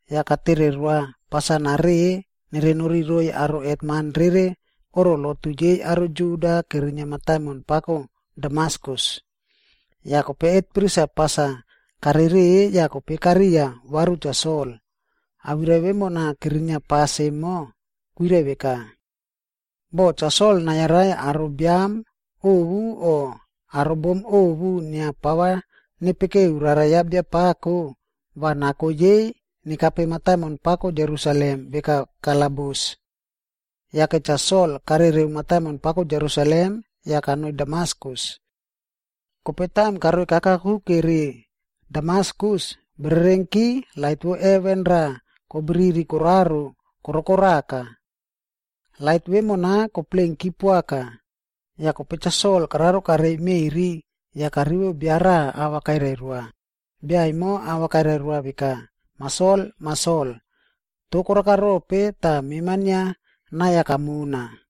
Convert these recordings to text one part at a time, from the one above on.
yah katere roa pas-a nareꞌe nerenori roiy aro hetman rere oꞌro lotu yei aro Juda kerinia mataimon pako Damaskus. Yah kope hetpris-a pas-a karereꞌe yah kope kariya varu Cha Sol. Awirai vemona kerinia pas emo, kwirai veka, “Boh Cha Sol nayarai aro biam ovu o aro bom ovu inia pava nepekeu Rara ya Biapako,a va nako yei nekape mataimon pako Jerusalem veka kalabus.” Yake Cha Sol karereu mataimon pako Jerusalem yah kanoi Damaskus. Kope taim karoika kakuke ri Damaskus, bererenki lait vo heven raꞌa kobriri koraro korokoraka. Lait vemona koplenki poaka, yah kope Cha Sol kararo karei meꞌri, yah karivo bia raꞌa ava kairai roa. Bia emo ava kairai roa veka, “Mah Sol, Mah Sol! Toh koraka rope tah mema inia nai-a kamona?”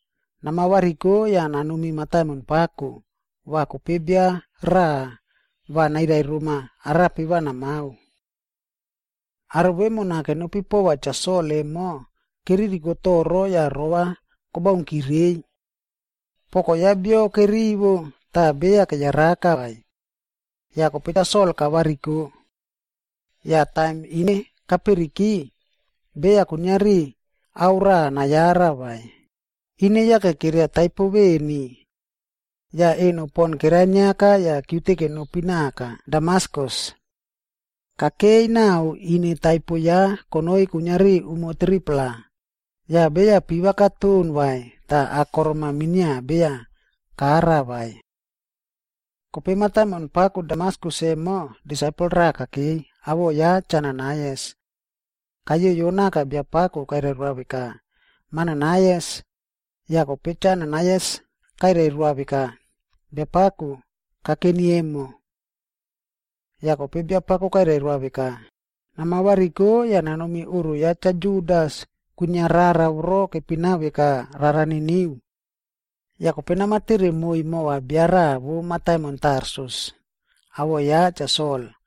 Nama variko yah nanomi mataimon pako, va kope bia raꞌa va nairai roma arape va namao.” Aro vemona kenopi pova Cha Sol emo, keririko toro yah rova kobaunkire reiy. Poko ya bio kerivo, toh beya keyaraka vai. Yah kope Cha Sol kavariko. Yah taim ine kaperiki, beya kuiniari ao rava nayara vai, ine yake keria taipo veni. Yah eno pon keraniaka yah kiute kenopi naka Damaskus. Kakei nao ine taipo ya konoi kuiniari umo 3-pla, yah beya piva katon vai tah akorom minia beya kara vai. Kope mataimon pako Damaskus emo, disaipel raꞌa kakei, awoꞌo ya Cha Ananaias. Kayoyo naka Biapako kairai roa veka, “Mah Ananaias.” Yah kope Cha Ananaias kairai roa veka, “Biapako, kakeni emo.” Yah kope Biapako kairai roa veka, “Nama variko yah namomi oꞌro ya Cha Judas kwinia rara voro kepina veka Rara Niniu. Yah kope nama tere moiy mova bia raꞌa vo mataimon Tarsus, awoꞌo ya Cha Sol.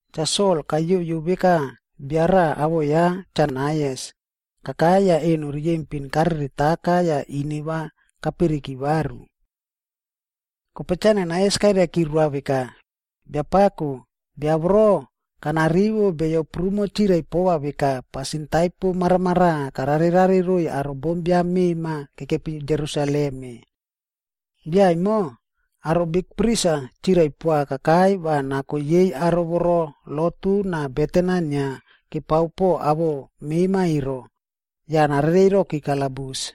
Cha Sol kayoyo veka bia raꞌa awoꞌo ya Cha Ananaias, kakai yah eno riyempin kareretaka yah ine va kaperiki varu.” Kope Cha Ananaias kairaiki roa veka, “Biapako, bia voro, kana rivo beyo prumo chirai pova veka pasin taipo maramaraꞌa karare rare roiy aro bombiam mema kekepi Jerusalem-e. Bia emo, aro bikpris-a chirai poa kakai va nako yei aro voro lotu na beten-a inia kepao po awoꞌo mema ero, yah narerei roki kalabus.”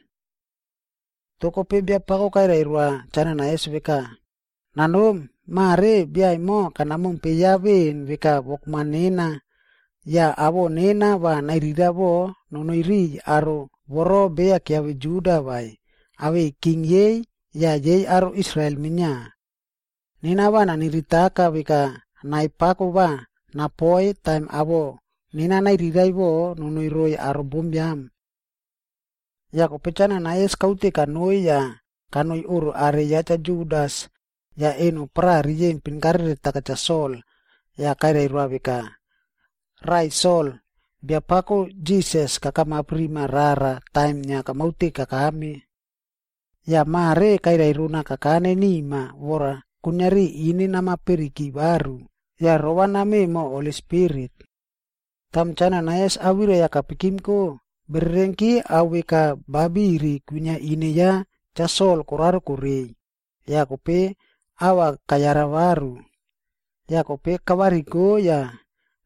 Toh kope Biapako kairai roa Cha Ananaias veka, “Nanomi! Mare bia emo kana mompe ya veꞌen veka wokman nena, yah awoꞌo nena va nairiraiꞌvo nanoi riꞌiy aro voro beya kiave Juda vai, awei king yei yah yei aro Israel minia. Nena va naniritaka veka nai pako va napoi taim awoꞌo nena nairiraiꞌvo nonoi roiy aro bombiam.” Yah kope Cha Ananaias kaute kanoi yah kanoi oꞌro are ya Cha Judas. Yah eno paraꞌa riyempin karereta Cha Sol, yah kairai roa veka, “Raꞌai Sol, Biapako Jisas kakamap rima rara taim inia kamaute kakame. Yah mare kairai rona kakane nima vora kuiniari ine nama periki varu yah rova name moho Holi Spirit.” Taim Cha Ananaias awirai-a kapikimko, bererenki ao veka ba biri kwinia ine ya Cha Sol koraro korei, yah kope ava kayara varu. Yah kope kavariko yah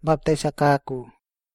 baptais-a kako.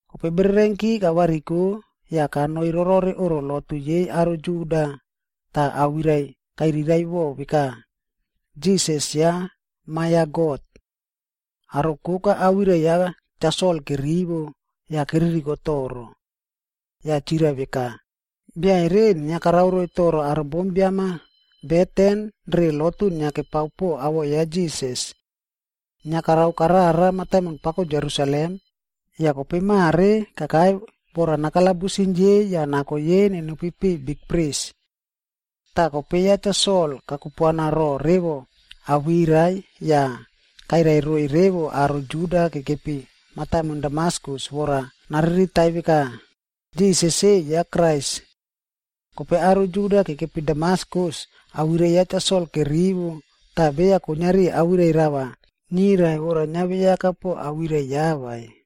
Kope bererenki kavariko yah kanoi rorore oꞌro lotu yei aro Juda tah awirai-a kairiraꞌvo veka, “Jisas ya Ma ya God”. Aro koka awirai ya Cha Sol kerivo, yah keririko toro. Yah chirai veka, “Bia ero inia karao roiy toro aro bombiam-a beten re lotu inia kepao po awoꞌo ya Jisas. Inia karao karara mataimon pako Jerusalem, yah kope mare kakai vora nakalabusim yei yah nako yei nenopi piꞌiy bikpris.” Tah kope ya Cha Sol kakupuana ro revo awirai ya tah kairai roiy revo aro Juda kekepi mataimon Damaskus vora nariritai veka, Jisas-e ya Krais. Kope aro Juda kekepi Damaskus awirai ya Cha Sol kerivo tah beya kuiniari awirai rava nirai vora niaveyaka po awirai ya vai.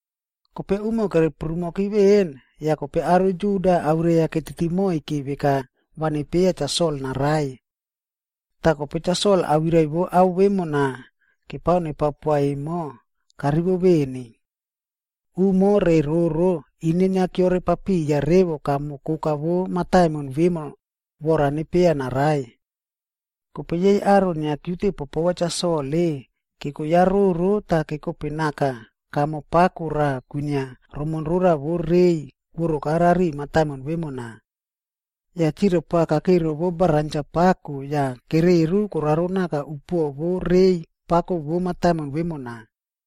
Kope umo kere prumoki veꞌen, yah kope aro Juda awirai-a ketiti moike veka va nepieya Cha Sol naraiy. Tah kope Cha Sol awirai vo ao vemona kepao nepao poa emo, karivo veni. Umo nai re roro, ine inia keore papiya revo kamo koka vo mataimon vemo vora nepieya naraiy. Kope yei aro inia kiute popova Cha Sol-e, keko ya roro tah kekope naka kamo pako raꞌa kwinia romonrora vo rei kworoka rari mataimon vemona. Yah chirai poa kakei rovo baranja pako yah kereru koraro naka upuoꞌo vo rei pako vo mataimon vemona.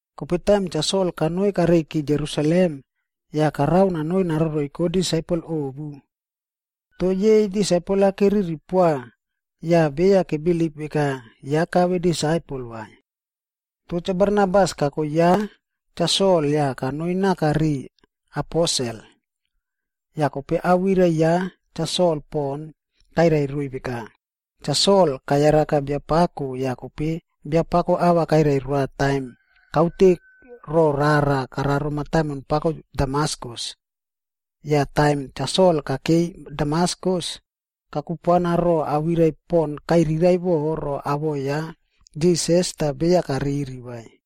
Kope taim Cha Sol kanoi kareiki Jerusalem, yah karao nanoi naroroiko disaipel ovu. Toh yei disaipel-a keriri poa yah beya kebilip veka ya kave disaipel vai. Toh Cha Barnabas kako ya Cha Sol yah kanoi naka riꞌiy aposel. Yah kope awirai ya Cha Sol pon kairai roiy veka, “Cha Sol kayaraka Biapako yah kope Biapako ava kairai roa taim kaute ro rara koraro mataimon pako Damaskus. Yah taim Cha Sol kakeiy Damaskus, kakupuana ro awirai pon kairiraiꞌvo ro awoꞌo ya Jisas tah beya kariri vai.”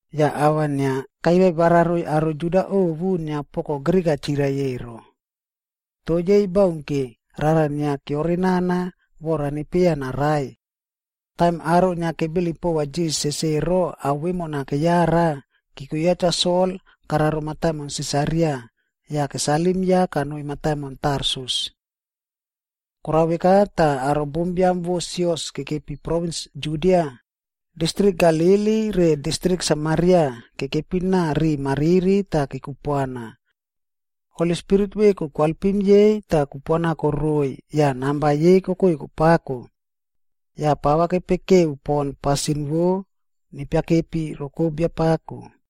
Yah ava inia kairai wararoiy aro Juda ovu inia poko Grik-a chirai ero. Toh yei baunke, rara inia keore nana vora nepieya naraiy. Taim aro inia kebilip pova Jisasc ero ao vemona keyara, keko ya Cha Sol kararo mataimon Sisaria, yah kesalim ya kanoi mataimon Tarsus. Korao veka tah aro bombiam vo sios kekepi provins Judia, distrik Galili re distrik Samaria kekepi naꞌa riꞌi mariri tah kekupuana. Holi Spirit veku koalpim yei tah kupuana koroi yah namba yei kokoi kopako. Yah pava kepekeu pon pasin vo nepiakepi roko Biapako.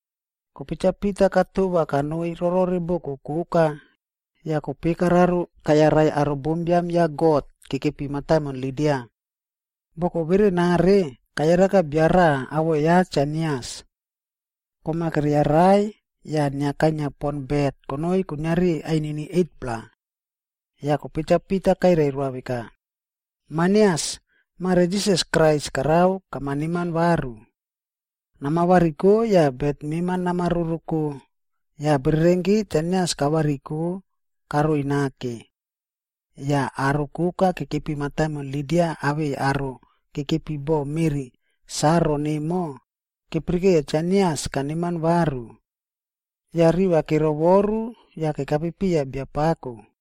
Kope Cha Pita katova kanoi rorore boko koka, yah kope kararo kayarai aro bombiam ya God kekepi mataimon Lida. Boko verenare, kayaraka bia raꞌa awoꞌo ya Cha Ainias. Kom-a keriaraiy yah inia kainia pon bet konoi kuiniari ainini 8-pla. Yah kope Cha Pita kairai roa veka, “Mah Ainias! Mare Jisas Krais karao kama neman varu. Nama variko yah bet mema nama roroko.” Yah bererenki Cha Ainias kavariko karoi nake. Yah aro koka kekepi mataimon Lida awei aro kekepi bo meꞌri Saron emo, kepirikeiya Cha Ainias kaneman varu. Yah riva kerovoru yah kekape piya Biapako.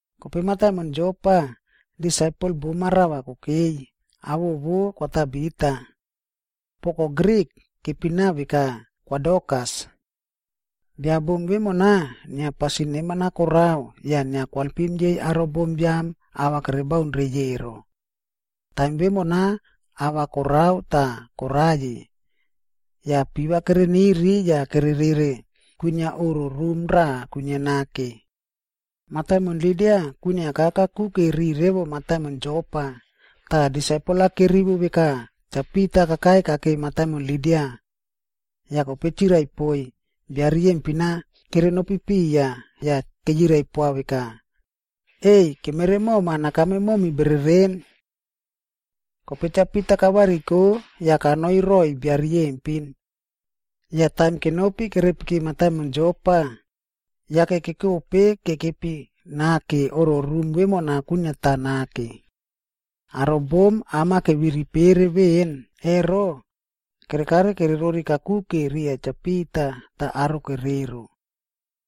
Kope mataimon Jopa, disaipel bom-a rava kokei, awoꞌo vo Kwa Tabita. (Poko Grik, kepina veka Kwa Dorkas.) Bia bom vemona, inia pasin neman-a korao yah inia koalpim yei aro bombiam ava kerebaun reiy ero. Taim vemona ah va korao tah koraiyi. Yah piva kereniri yah kere rere kwinia oꞌro rum raꞌa kwinia nake. Mataimon Lida kwiniaka kakuke ri revo mataimon Jopa, tah disaipel-a kerivo veka Cha Pita kakai kakei mataimon Lida. Yah kope chirai poiy bia riyempin-a kerenopi piya yah keyirai poa veka, “Ei, kemere moma nakame momi bereren!” Kope Cha Pita kavariko yah kanoi roꞌoiy bia riyempin. Yah taim kenopi kerepiki mataimon Jopa, yake kekope kekepi naka oꞌro rum vemona kwiniata nake. Aro bom am-a keviri pere veꞌen ero, kerekare kererori kakuke riya Cha Pita tah aro kerero.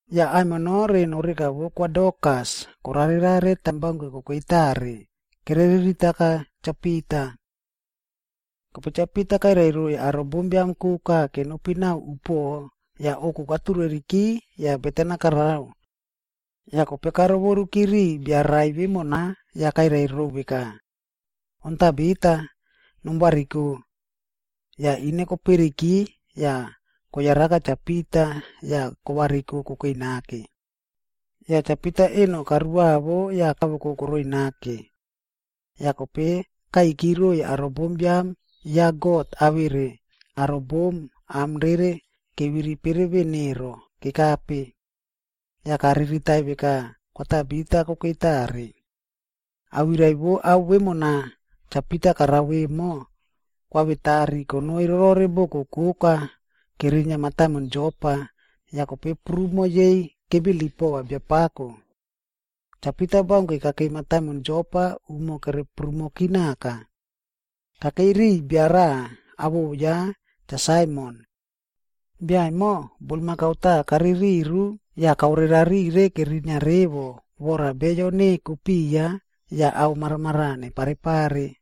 Yah aimino re noreka vo Kwa Dorkas korare rare taim baunke kokei tare, kere riritaka Cha Pita. Kope Cha Pita kairai roiy aro bombiam koka kenopi naꞌao upuoꞌo, yah ouku katureriki yah beten-a karao. Yah kope karovoruki ri bia rai vemona yah kairai rou veka, “On Tabita, nom variko.” Yah ine koperiki yah koyaraka Cha Pita yah kovariko kokei nake. Yah Cha Pita eno karuavo yah kawoko koroi nake. Yah kope kaiki roiy aro bombiam ya God awere aro bom am rere keviri pere veꞌen ero, kekape. Yah kariritai veka Kwa Tabita kokei tare. Awirai vo ao vemona Cha Pita karao emo, kwavetari konoi rorore boko koka kerinia mataimon Jopa, yah kope prumo yei kebilip pova Biapako. Cha Pita baunke kakei mataimon Jopa umo kere prumoki naka. Kakei riya bia raꞌa awoꞌo ya Cha Saimon. Bia emo, bulmakau taꞌa kaririru yah kaore rarire kerinia revo vora beyo neko piya yah ao maramaraꞌa nepare pare.